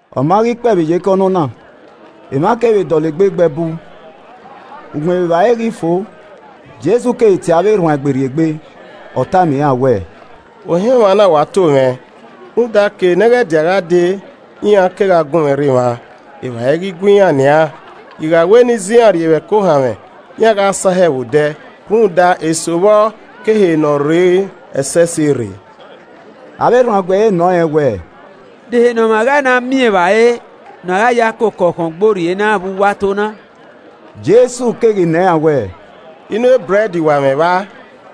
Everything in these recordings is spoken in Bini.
Ọma ghi kpee vbe iyeke ọnọna, emwa kevbe dọlegbe gbe ẹbu. Ugbẹn vbe evbare ghi fo, Jesu keghi tie avbe erhuanegbe rrie egbe, ọ tama iran wẹẹ, “Ohan emwa na wa to mwẹ, rhunmwuda ke nẹghẹdia gha dee iran kegha gunmwẹ rre emwa, evbare i ghi gue iran nian. I gha wẹ ne I zẹ iran urrie vbe ẹko ohanmwẹ, iran gha sahẹ vbe odẹ rhunmwuda eso vbọ ke ehe ne ọ rrei ẹsẹse rre.” Avbe erhuanegbe ẹre nọ rẹn wẹ, “De ehe ne ọmwa gha na miẹn evbare ne ọ gha ya koko ọkhọngborrie na vbe uwu ato na.” Jesu keghi nọ iran wẹẹ, “Inu ebrẹd wa mwẹ vba?”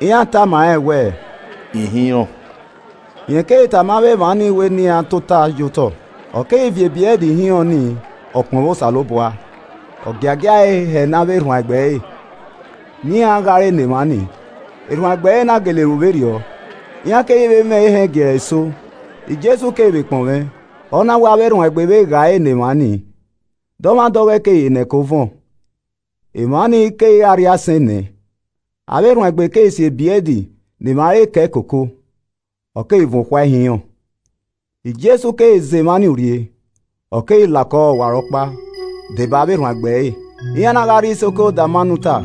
Iran tama rẹn wẹẹ, “Ihinrọn.” Rẹn keghi tama avbe emwa ni wẹ ne iran tota ye otọ. Ọ keghi viọ ebrẹd ihinrọn ni, ọ kpọnmwẹ Osanobua, ọ giagia ẹe hẹ ne avbe erhuanegbe ẹre ne iran ghae ẹre ne emwa nii, erhuanegbe ẹre na gele ru vberriọ. Iran keghi vbe mwẹ ehẹn giẹrẹ eso, Jesu keghi vbe kpọnmwẹ, ọ na we avbe erhuanegbe vbe gha ẹre ne emwa ni. Dọmwadẹ ọghọe keghi re ne ẹko vuọn. Emwa ni keghi re arriaisẹn enẹ. Avbe erhuanegbe keghi si ebrẹd ne emwa re kẹe koko, ọ keghi vuọn okhuae ihinrọn. Jesu keghi zẹ emwa ni urrie. Ọ keghi la okọ ọwarọkpa, deba avbe erhuanegbe ẹre, iran na gha rrie isoko Dalmanuta.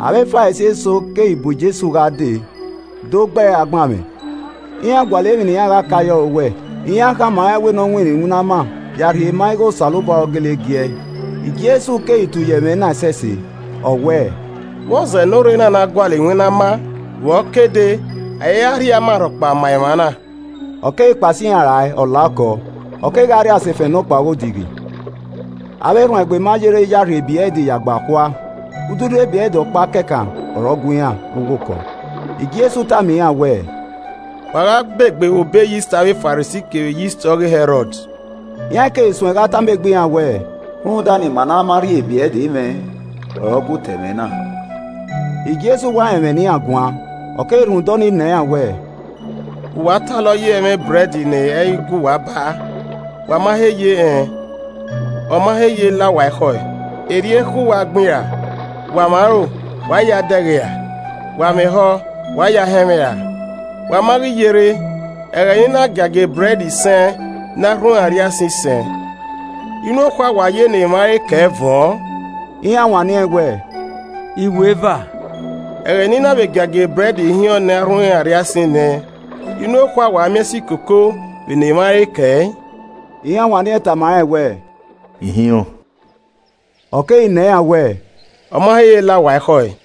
Avbe Farisi eso keghi bu Jesu gha dee do gbe ẹre agbanmwẹ. Iran gualọ emwi ne iran gha ka ye ọre owẹ. Iran khama rẹn wẹ ne ọ winna iwinna ama ya rhie ma ighẹ Osanobua ọre ọ gele giẹe. Jesu keghi tu ye ẹmwẹ na ẹsẹse, ọ wẹẹ, “Vbọzẹ ne orre na na gualọ iwinna ama. Vbe ọ ke dee! A i ra rhie ama rhọkpa ma emwa na.” Ọ keghi kpao sẹ iran rae, ọ la okọ, ọ kegha rrie asefẹn nọkpa ọghe odighi. Avbe erhuanegbe ma yerre ya rhie ebrẹd ya gbe akhua. Ududu ebrẹd ọkpa kẹkan ọre ọ gue iran vbe uwu okọ. Jesu tama iran wẹẹ, “Wa gha begbe vbe obọ eyist avbe Farisi kevbe eyist ọghe Hẹrọd.” Iran keghi suẹn gha tama egbe iran wẹẹ, “Rhunmwuda ne ima ma na rhie ebrẹd mwẹ ọre ọ gu ta ẹmwẹ na.” Jesu wa rẹn ẹmwẹ ne iran guan, ọ keghi rhunmwuda ọnii nọ iran wẹẹ, “Vbe uwu talọ ye ẹmwẹ ebrẹd ne ẹ i gue uwa baa? Wa ma he ye rẹn, ọ ma he ye la uwa ekhọe. Erriọ ekhọe uwa gbin ra? Wa mwẹ aro, wa i ya ẹe dẹghe ra? Wa mwẹ ehọ, wa i ya ẹe họn ẹmwẹ ra? Wa ma ghi ye rre? Ẹghẹ ne I na giagia ebrẹd isẹn ne arhunmwu arriaisẹn isẹn, inu okhuae wa ya ne emwa re kẹe vuọn?” Iran wanniẹn wẹ, “Iweva.” “Ẹghẹ ne I na vbe giagia ebrẹd ihinrọn ne arhunmwu arriaisẹn enẹ, inu okhuae wa miẹn si koko vbe ne emwa re kẹe?” Iran wanniẹn tama rẹn wẹ, “Ihinrọn.” Ọ keghi nọ iran wẹẹ, “Ọma he ye la uwa ekhọe?”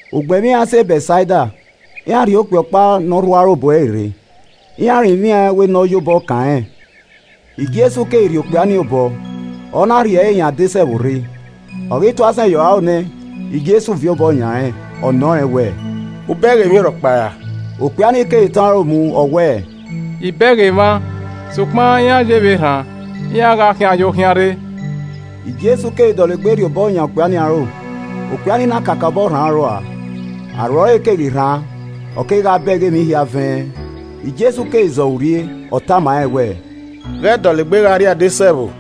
Ugbẹn vbe iran sẹ Bẹtsaida, iran rhie okpia ọkpa ne ọ rhu aro bu ẹre rre, iran rinmwian ẹn wẹ ne ọ ya obọ kan rẹn. Jesu keghi rhie okpia ni obọ, ọ na rhie ẹre hin adesẹ ẹvbo rre. Ọ ghi tu asẹn ye ọre aro nẹ, Jesu viọ obọ yan rẹn, ọ nọ rẹn wẹẹ, “U bẹghe emwi rhọkpa ra?” Okpia ni keghi tọn aro mu ọ wẹẹ, “I bẹghe emwa, sokpan iran ye vbe erhan, iran gha khian yo khian rre.” Jesu keghi dọlegbe rhie obọ yan okpia ni aro, okpia ni na kakabọ rhan aro rua, aro ẹre keghi rhan, ọ kegha bẹghe emwi hia vẹ ẹn. Jesu keghi zẹ ọre urrie, ọ tama rẹn wẹẹ, “Ghẹ dọlegbe gha rrie adesẹ ẹvbo.”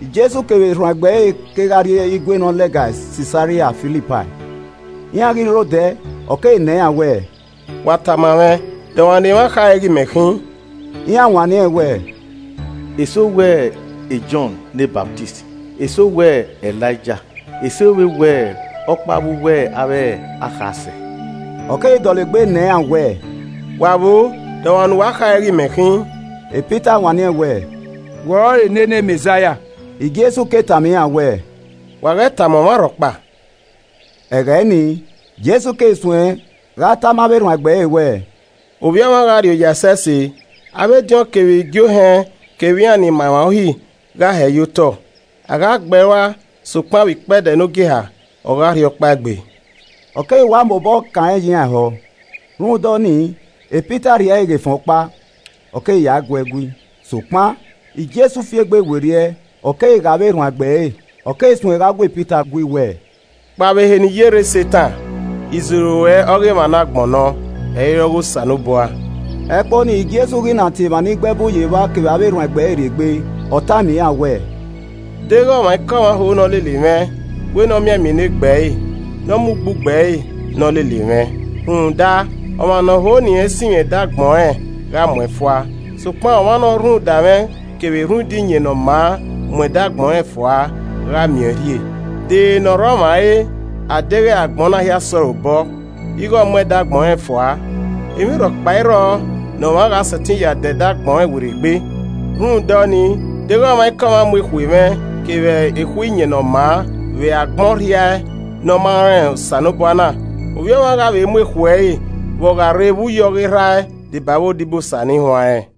Jesu kevbe erhuanegbe ẹre kegha rrie igue ni lẹga Sisaria Filipai. Iran ghi rre odẹ, ọ keghi nọ iran wẹẹ, “Wa tama mwẹ, de ọmwa ne emwa khare ighe imẹ khin?” Iran wanniẹn wẹẹ, “Eso wẹ Jọn ne Ọsamẹ, eso wẹ Elaija, eso vbe wẹ ọkpa vbe uwu avbe akhasẹ.” Ọ keghi dọlegbe nọ iran wẹẹ, “Wa vboo? De ọmwa ne uwa khare ighe imẹ khin?” Pita wanniẹn wẹẹ, “Wẹ ọrọre nene Mẹzaia.” Irẹn keghi tama iran wẹẹ, “Wa ghẹ tama ọmwa rhọkpa.” Ẹghẹ ni, Jesu keghi suẹn gha tama avbe erhuanegbe ẹre wẹẹ, “Ovbi Ọmwa gha rrioya ẹsẹse, avbe ediọn kevbe igie ohẹn kevbe iran ni ma emwa Uhi gha hẹee ye otọ. A gha gbe ẹe rua sokpan vbe. ikpẹdẹ nogieha, ọ gha rhiọkpaegbe.” Ọ keghi wa mobọ kan rẹn ye iran ehọ. Rhunmwuda ọnii Pita rhie ẹre ghe efẹn ọkpa, ọ keghi ya gha guee gui. Sokpan Jesu fi egbe werriẹ ọ keghi ghe avbe erhuanegbe ẹre, ọ keghi suẹn gha gu Pita gui wẹẹ, “Kpao vbe ehe ne I ye rre Setan, iziro ruẹ ọghe emwa ne agbọn nọ, ẹ i re ọghe Osanobua.” Ẹkpo nii Jesu ghi na tie emwa ni gbe ẹbu ye evba kevbe avbe erhuanegbe ẹre rrie egbe, ọ tama iran wẹẹ, “Deghẹ ọmwaikọmwa ho ne ọ lele mwẹ, wẹ ne ọ mianmian enegbe ẹre, ne ọ mu ugbugbe ẹre, ne ọ lele mwẹ. Rhunmwuda ọmwa ne ọ ho ne irẹn sinmwi ẹdẹ agbọn ẹnrẹn gha mu ẹn fua, sokpan ọmwa ne ọ rhunmwuda mwẹ kevbe rhunmwuda iyẹn ne ọ maa mu edẹ agbọn rẹn fua, gha miẹn ọẹn rhie. De ere ne ọ rre ọmwa re, a deghẹ agbọn na hia sẹ ọre obọ, ighe ọ mu ẹdẹ agbọn rẹn fua. Emwi ọkpa i rrọọ ne ọmwa gha sẹtin ya dẹ ẹdẹ agbọn rẹn werriegbe. Rhunmwuda ọnii, deghẹ ọmwaikọmwa mu ekhue mwẹ kevbe ekhue iyẹn ne ọ maa vbe agbọn ọrhiae ne ọ maa rẹn Osanobua na, Ovbi Ọmwa gha vbe mu ekhue ẹre vbe ọ gha rre vbe uyi ọghe Erha ẹe deba avbe odibosa ni huanrẹn.”